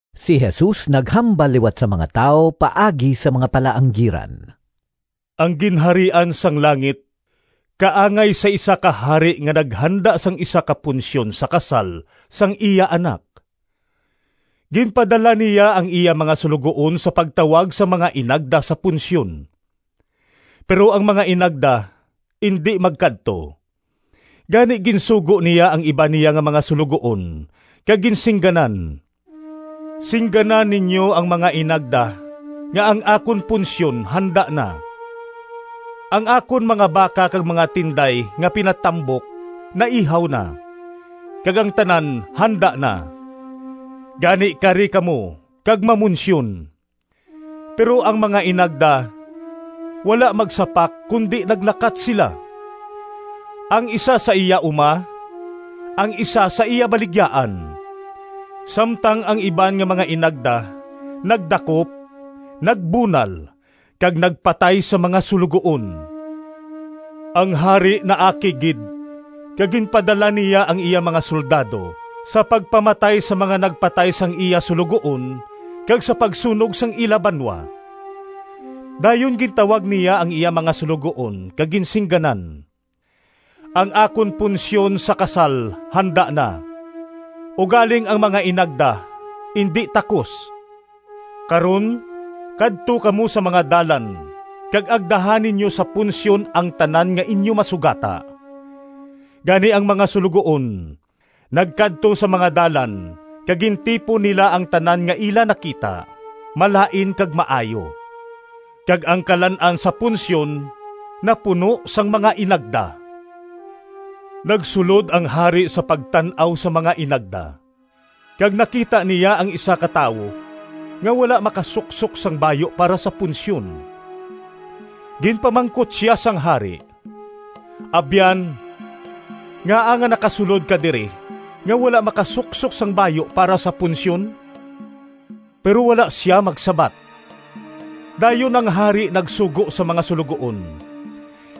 Si Jesus naghambal liwat sa mga tawo paagi sa mga palaanggiran. “Ang Ginharian sang langit kaangay sa isa ka hari nga naghanda sang isa ka punsyon sa kasal sang iya anak. Ginpadala niya ang iya mga suloguon sa pagtawag sang mga inagda sa punsyon, pero ang mga inagda indi magkadto. Gani ginsugo niya ang iban niya nga mga suloguon kag ginsingganan, ‘Singgana ninyo ang mga inagda nga ang akon punsyon handa na, ang akon mga baka kag mga tinday nga pinatambok naihaw na, kag ang tanan handa na. Gani kari kamo kag mamunsyon!’ Pero ang mga inagda wala magsapak kundi naglakat sila: ang isa sa iya uma, ang isa sa iya baligyaan, samtang ang iban nga mga inagda nagdakop, nagbunal, kag nagpatay sa mga suloguon. Ang hari naakig gid, kag ginpadala niya ang iya mga soldado sa pagpamatay sa mga nagpatay sang iya suloguon, kag sa pagsunog sang ila banwa. Dayon gintawag niya ang iya mga suloguon kag ginsingganan, ‘Ang akon punsyon sa kasal handa na, ugaling ang mga inagda indi takos. Karon kadto kamo sa mga dalan kag agdaha ninyo sa punsyon ang tanan nga inyo masugata.’ Gani ang mga suloguon nagkadto sa mga dalan kag gintipon nila ang tanan nga ila nakita, malain kag maayo. Kag ang kalan-an sa punsyon napuno sang mga inagda. “Nagsulod ang hari sa pagtan-aw sang mga inagda, kag nakita niya ang isa ka tawo nga wala makasuksok sang bayu para sa punsyon. Ginpamangkot sia sang hari, ‘Abyan, ngaa nga nakasulod ka diri nga wala makasuksok sang bayu para sa punsyon?’ Pero wala sia magsabat. Dayon ang hari nagsugo sa mga suloguon,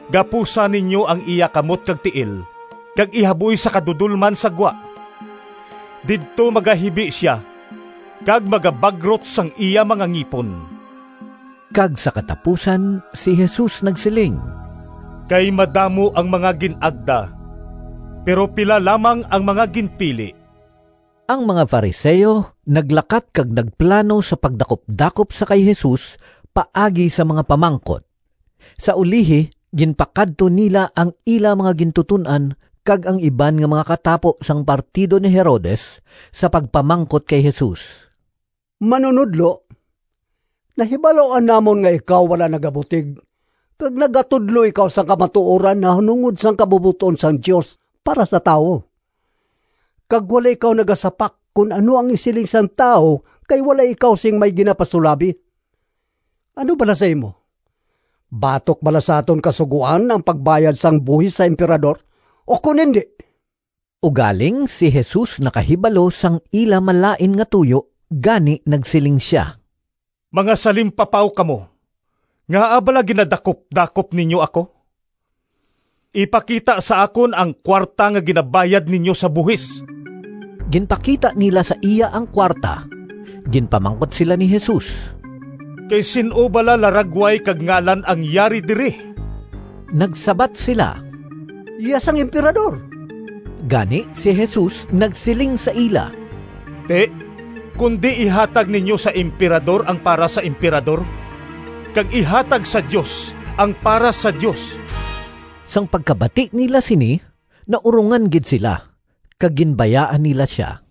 ‘Gapusa ninyo ang iya kamot kag tiil kag ihaboy sa kadudolman sa gwa. Didto magahibi sia kag magabagrot sang iya mga ngipon.’” Kag sa katapusan si Jesus nagsiling, “Kay madamo ang mga gin-agda, pero pila lamang ang mga ginpili.” Ang mga Fariseo naglakat kag nagplano sa pagdakupdakop sa kay Jesus paagi sa mga pamangkot. Sa ulihi ginpakadto nila ang ila mga gintuton-an kag ang iban nga mga katapo sang partido ni Herodes sa pagpamangkot kay Jesus, “Manunodlo, nahibaluan namon nga ikaw wala nagabutig kag nagatudlo ikaw sang kamatuoran nahanungod sang kabubot-on sang Dios para sa tawo kag wala ikaw nagasapak kon ano ang isiling sang tawo kay wala ikaw sing may ginapasulabi. Ano bala sa imo? Batok bala sa aton Kasugoan ang pagbayad sang buhis sa Emperador ukon indi?” Ugaling si Jesus nakahibalo sang ila malain nga tuyo gani nagsiling sia, “Mga salimpapaw kamo! Ngaa bala ginadakupdakop ninyo ako? Ipakita sa akon ang kuwarta nga ginabayad ninyo sa buhis!” Ginpakita nila sa iya ang kuwarta. Ginpamangkot sila ni Jesus, “Kay sin-o bala laragway kag ngalan ang yari diri?” Nagsabat sila, “Iya sang Emperador.” Gani si Jesus nagsiling sa ila, “Ti, kundi ihatag ninyo sa Emperador ang para sa Emperador, kag ihatag sa Dios ang para sa Dios.” Sang pagkabati nila sini, naurongan gid sila kag ginbayaan nila sia.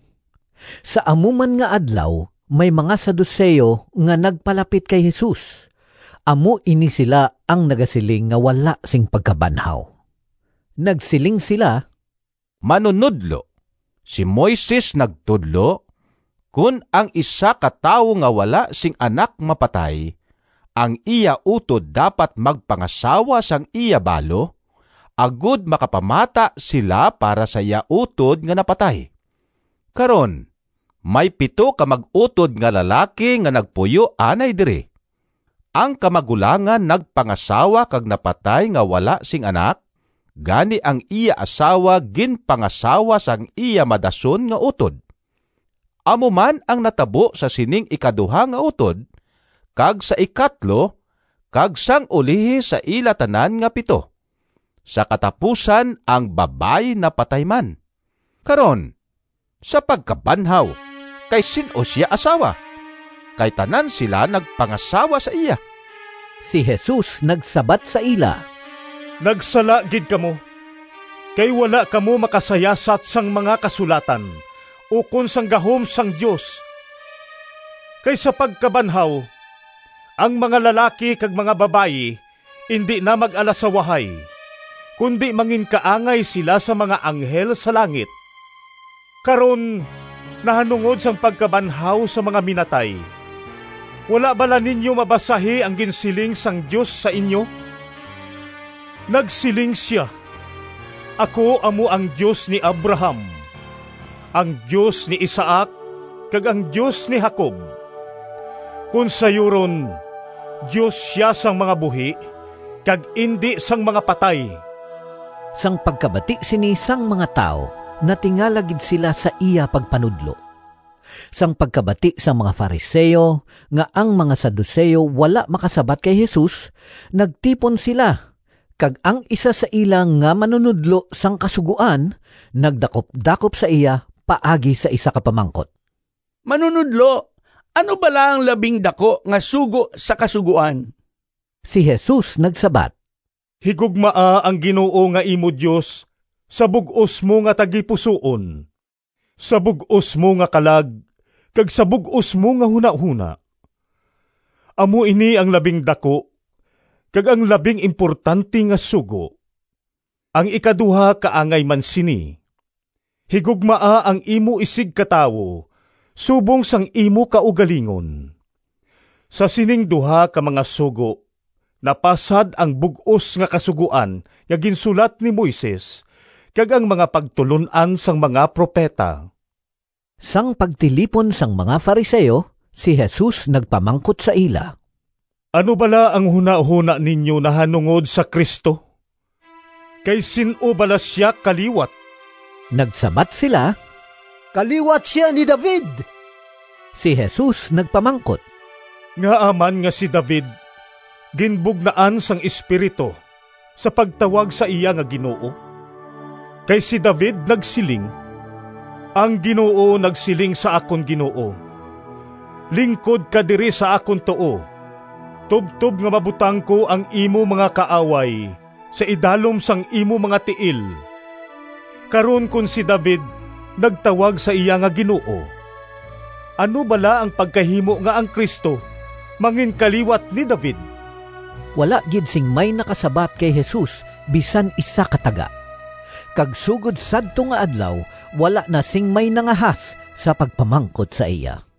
Sa amo man nga adlaw may mga Saduceo nga nagpalapit kay Jesus. (Amo ini sila ang nagasiling nga wala sing pagkabanhaw.) Nagsiling sila, “Manunodlo, si Moises nagtudlo, ‘Kon ang isa ka tawo nga wala sing anak mapatay, ang iya utod dapat magpangasawa sang iya balo, agod makapamata sila para sa iya utod nga napatay.’ Karon, may pito ka mag-utod nga lalaki nga nagpuyo anay diri. Ang kamagulangan nagpangasawa kag napatay nga wala sing anak, gani ang iya asawa ginpangasawa sang iya madason nga utod. Amo man ang natabo sa sining ikaduha nga utod, kag sa ikatlo, kag sang ulihi sa ila tanan nga pito. Sa katapusan ang babayi napatay man. Karon, sa pagkabanhaw kay sin-o sia asawa, kay tanan sila nagpangasawa sa iya?” Si Jesus nagsabat sa ila, “Nagsala gid kamo, kay wala kamo makasayasat sang mga Kasulatan ukon sang gahom sang Dios. Kay sa pagkabanhaw, ang mga lalaki kag mga babayi indi na mag-alasawahay, kundi manginkaangay sila sang mga anghel sa langit. Karon nahanungod sang pagkabanhaw sang mga minatay, wala bala ninyo mabasahi ang ginsiling sang Dios sa inyo? Nagsiling sia, ‘Ako amo ang Dios ni Abraham, ang Dios ni Isaac, kag ang Dios ni Jacob.’ Kon sayuron, Dios sia sang mga buhi kag indi sang mga patay.” Sang pagkabati sini sang mga tawo natingala gid sila sa iya pagpanudlo. Sang pagkabati sang mga Fariseo nga ang mga Saduceo wala makasabat kay Jesus, nagtipon sila, kag ang isa sa ila nga manunodlo sang Kasugoan, nagdakupdakop sa iya paagi sa isa ka pamangkot, “Manunodlo, ano bala ang labing daku nga sugo sa Kasugoan?” Si Jesus nagsabat, “ ‘Higugmaa ang Ginoo nga imo Dios sa bug-os mo nga tagipusoon, sa bug-os mo nga kalag, kag sa bug-os mo nga hunahona.’ Amo ini ang labing daku kag ang labing importante nga sugo. Ang ikaduha kaangay man sini, ‘Higugmaa ang imo isigkatawo subong sang imo kaugalingon.’ Sa sining duha ka mga sugo napasad ang bug-os nga Kasugoan nga ginsulat ni Moises kag ang mga pagtulon-an sang mga propeta.” Sang pagtilipon sang mga Fariseo, si Jesus nagpamangkot sa ila. “Ano bala ang hunahona ninyo nahanungod sa Cristo? Kay sin-o bala sia kaliwat?” Nagsabat sila, “Kaliwat sia ni David.” Si Jesus nagpamangkot, “Ngaa man nga si David ginbugnaan sang Espiritu sa pagtawag sa iya nga ‘Ginoo’? Kay si David nagsiling: ‘Ang Ginoo nagsiling sa akon Ginoo, Lingkod ka diri sa akon tuo, Tubtob nga mabutang ko Ang imo mga kaaway Sa idalom sang imo mga tiil.’ Karon kon si David nagtawag sa iya nga ‘Ginoo,’ ano bala ang pagkahimo nga ang Cristo manginkaliwat ni David?” Wala gid sing may nakasabat kay Jesus bisan isa ka taga, kag sugod sadto nga adlaw wala na sing may nangahas sa pagpamangkot sa iya.